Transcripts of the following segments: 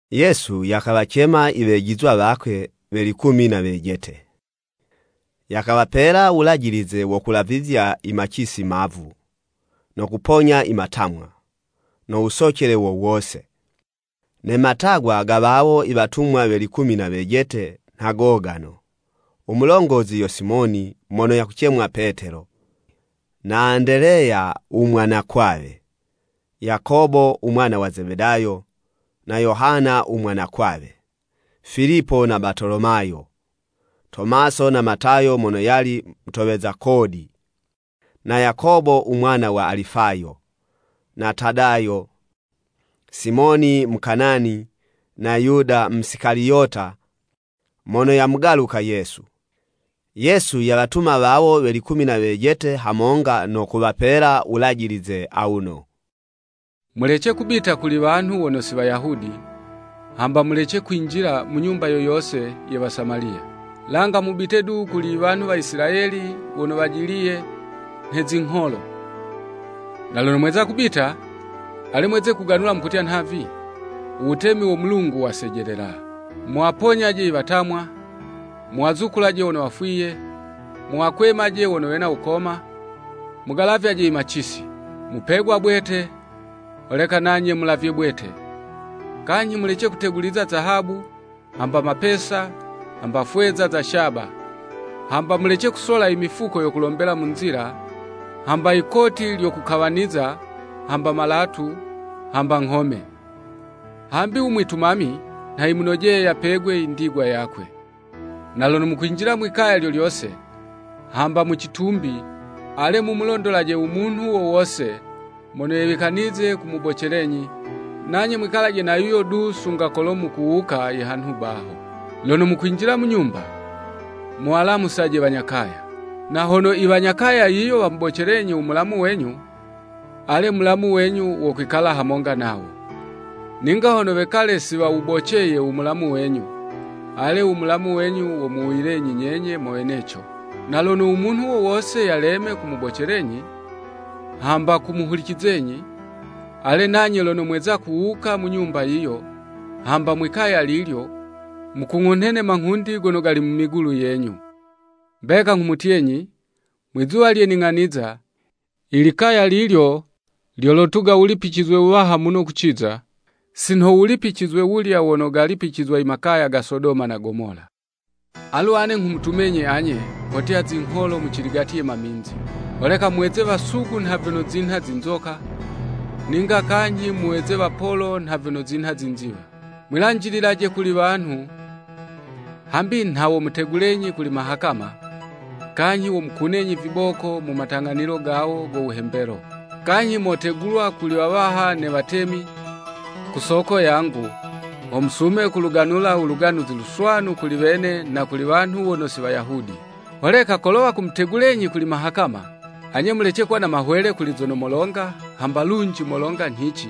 Yesu yakawacema iwejizwa wakwe we likumi na wejete, yakawapela wulajilize wo kulavizya imacisi mavu, no kuponya imatamwa, no wusocele wo wose. Ne matagwa ga wawo iwatumwa we likumi na wejete nha gogano; u mulongozi yo Simoni, mono yakucemwa Petelo, na Andeleya u mwanakwawe, Yakobo u mwana wa Zebedayo, na Yohana u mwanakwawe, Filipo na Batolomayo, Tomaso na Matayo mono yali mutoweza kodi, na Yakobo u mwana wa Alifayo, na Tadayo, Simoni Mukanani, na Yuda Musikaliyota mono yamugaluka Yesu. Yesu yawatuma wawo we likumi na wejete hamonga no kuwapela wulajilize awuno, “Mulece kubita kuli wanhu wono si Wayahudi, hamba mulece kwinjila mu nyumba yo yose ye Wasamaliya. Langa mubite du kuli iwanhu wa Isilayeli wono wajiliye nhe zingholo. Na lono mweza kubita, ale mweze kuganula mukutya nhavi, ‘U wutemi wo Mulungu wasejelela.’ Muwaponyaje iwatamwa, muwazukulaje wono wafwiye, muwakwemaje wono wena wukoma, mugalavyaje imacisi. Mupegwa bwete, holeka nanye mulavye bwete. Kanyhi mulece kuteguliza zahabu, hamba mapesa, hamba fweza za shaba. Hamba mulece kusola imifuko yo kulombela mu nzila, hamba yikoti lyo kukawaniza, hamba malatu, hamba nghome. Hambi u mwitumami nha yanojeye yapegwe i ndigwa yakwe. Na lono mukwinjila mwi'kaya lyo lyose, hamba mu citumbi, ale mumulondolaje u munhu wo wose mono yewikanize kumubocelenyi, nanye mwikalanaje na yuyo du sunga kolo mukuwuka ihanhu baho. Lono mukwinjila mu nyumba, muwalamusaje wanya kaya. Na hono iwanya kaya yiyo wamubocelenyi u mulamu wenyu, ale mulamu wenyu wokwikala hamonga nawo. Ninga hono wekale si wawuboceye u mulamu wenyu, ale u mulamu wenyu womuwuyilenyi nyenye mo weneco. Na lono u munhu wo wose yaleme kumubocelenyi, hamba kumuhulicizenyi, ale nanye lono mweza kuwuka mu nyumba yiyo, hamba mwi'kaya lilyo, mukung'unhe ne manghundi gono gali mu migulu yenyu. Mbeka nghumutyenyi, Mwizuwa lye ning'aniza, ilikaya lilyo lyolotuga wulipicizwe wuwaha muno kuciza, si nho wulipicizwe wulya wono galipicizwa i makaya ga Sodoma na Gomola.” “Alu ane nghumutumenyi anye, kotya zingholo muciligati ye maminzi. Holeka muweze wasugu nha vyono zinha zinzoka, ninga kanyhi muweze wapolo nha vyono zinha zinziwa. Mwilanjililaje kuli wanhu, hambi nha womutegulenyi kuli mahakama, kanyhi womukunenyi viboko mu matang'anilo gawo go wuhembelo. Kanyhi motegulwa kuli wawaha ne watemi, ku soko yangu, ho musume kuluganula u Luganuzi Luswanu kuli wene na kuli wanhu wono si Wayahudi. Holeka kolo wakumutegulenyi kuli mahakama, anye mulece kuwa na mahwele kuli zono molonga hamba lunji molonga nyhici,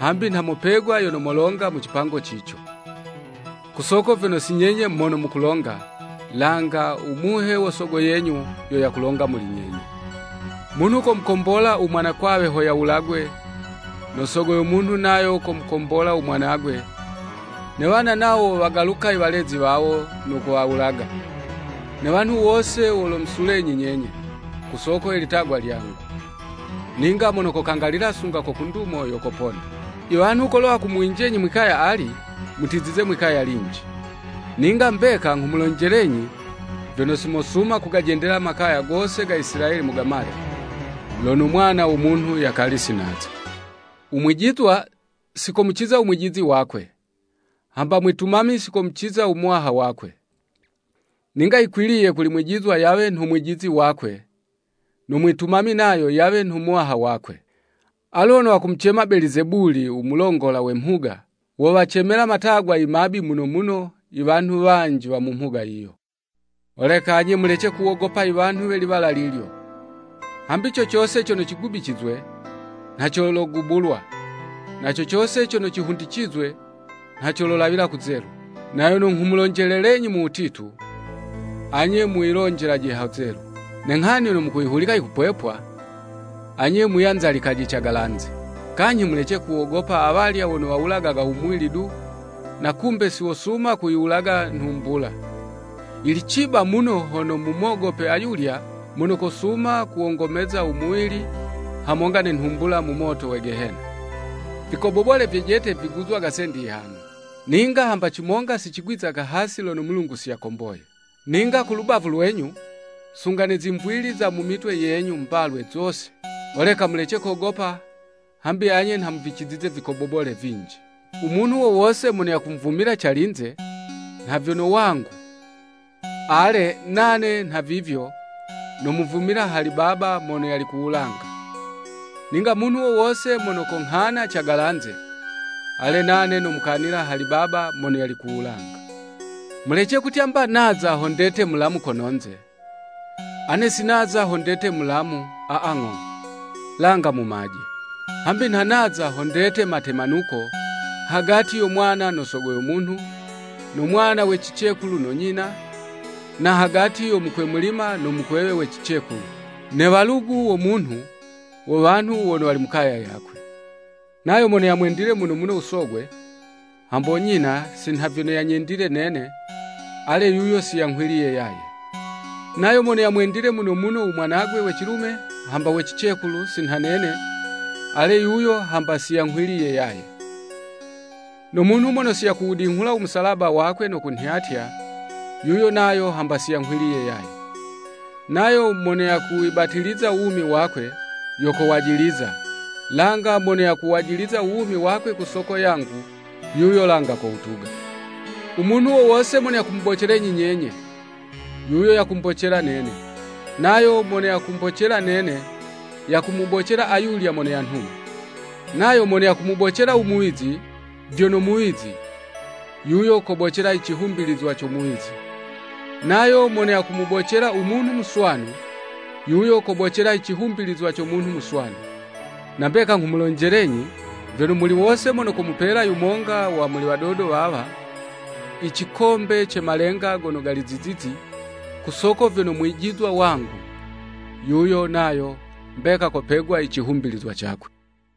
hambi nha mopegwa yono molonga mu cipango cico. Ku soko vyono si nyenye mono mukulonga, langa u Muhe wo Sogo yenyu, yo yakulonga muli nyenye. “Munhu komukombola u mwanakwawe ho yawulagwe, no sogo yo munhu nayo komukombola u mwanagwe, ne wana nawo wowagaluka iwalezi wawo no kuwawulaga. Ne wanhu wose wolomusulenyi nyenye, ku soko ye litagwa lyangu. Ninga mono kokangalila sunga ko ku ndumo yo kopona. “Iwanhu kolo wakumuwinjenyi mwi'kaya ali, mutizize mwi'kaya linji. Ninga mbeka nghumulonjelenyi vyono, si mosuma kugajendela makaya gose ga Isilayeli mugamale, lono u Mwana wo Munhu yakali si naza. “U mwijizwa, si komuciza u mwijizi wakwe, hamba mwitumami si komuciza u muwaha wakwe. Ninga yikwiliye kuli mwijizwa yawe nho mwijizi wakwe, no mwitumami nayo yawe nho muwaha wakwe. Alu hono wakumucema Belizebuli u mulongola we mhuga, wowacemela matagwa i mabi muno muno iwanhu wanji wa mu mhuga yiyo.” “Holeka anye mulece kuwogopa iwanhu we liwala lilyo. Hambi co cose cono cigubicizwe, nha cologubulwa, na co cose cono cihundicizwe nha cololawila kuzelu. Na yono nghumulonjelelenyi mu wutitu, anye muyilonjelaje hazelu, ne nghani yono mukuyihulika yikupwepwa, anye muyanzalikaje cagalanze. Kanyhi mulece kuwogopa awalya wono wawulagaga u muwili du, na kumbe si wosuma kuyiwulaga nhumbula. Yili ciba muno hono mumogope ayulya mono kosuma kuwongomeza u muwili, hamonga ne nhumbula mu moto we gehena. Vikobobole vyejete viguzagwa sendi yihano. Ninga hamba cimonga si cigwizaga hasi lono u Mulungu si yakomboye. Ninga kulubavu lwenyu, sunga ne zimvili za mu mitwe yenyu mbalwe zose. Holeka mulece kogopa hambi anye nha muvicizize ivikobobole vinji.” “U munhu wo wose mono yakumvumila calinze, nha vyono wangu, ale, nane nhavivyo, nomuvumila hali Baba mono yali ku wulanga. Ninga munhu wo wose mono konghana cagalanze, ale nane nomukanila hali Baba mono yali ku wulanga.” “Mulece kutya 'mba naza ho ndete mulamu kono'nze. Ane si naza ho ndete mulamu aa ng'o, langa mumaje. Hambi nha naza ho ndete matemanuko, hagati yo mwana no sogo yo munhu, no mwana we cicekulu no nyina, na hagati yo mukwemulima no mukwewe we cicekulu. Ne walugu wo munhu, wo wanhu wono wali mu kaya yakwe. “Nayo mono yamwendile muno muno u sogwe, hambo nyina si nha vyono yanyendile nene, ale yuyo siyanghwiliye yaye. Nayo mono yamwendile muno muno u mwanagwe we cilume hamba we cicekulu si nha nene, ale yuyo hamba si yanghwiliye yaye. No munhu mono si yakuwudinghula u musalaba wakwe, no kunhyatya, yuyo nayo hamba si yanghwiliye yaye. Nayo mono yakuwibatiliza u wumi wakwe, yo kowajiliza, langa mono yakuwajiliza u wumi wakwe ku soko yangu, yuyo langa kowutuga.” “U munhu wo wose mono yakumubocelenyi nyenye, yuyo yakumbocela nene, nayo mono yakumbocela nene, yakumubocela ayulya mono yanhuma. Nayo mono yakumubocela u muwizi, vyono muwizi, yuyo kobocela icihumbilizwa co muwizi. Nayo mono yakumubocela u munhu muswanu, yuyo kobocela i cihumbilizwa co munhu muswanu. Na mbeka nghumulonjelenyi vyono, muli wose mono komupela yumonga wa muli wadodo wawa i cikombe ce malenga gono gali zizizi, ku soko vyono mwijizwa wangu, yuyo nayo mbeka kopegwa icihumbilizwa cakwe.”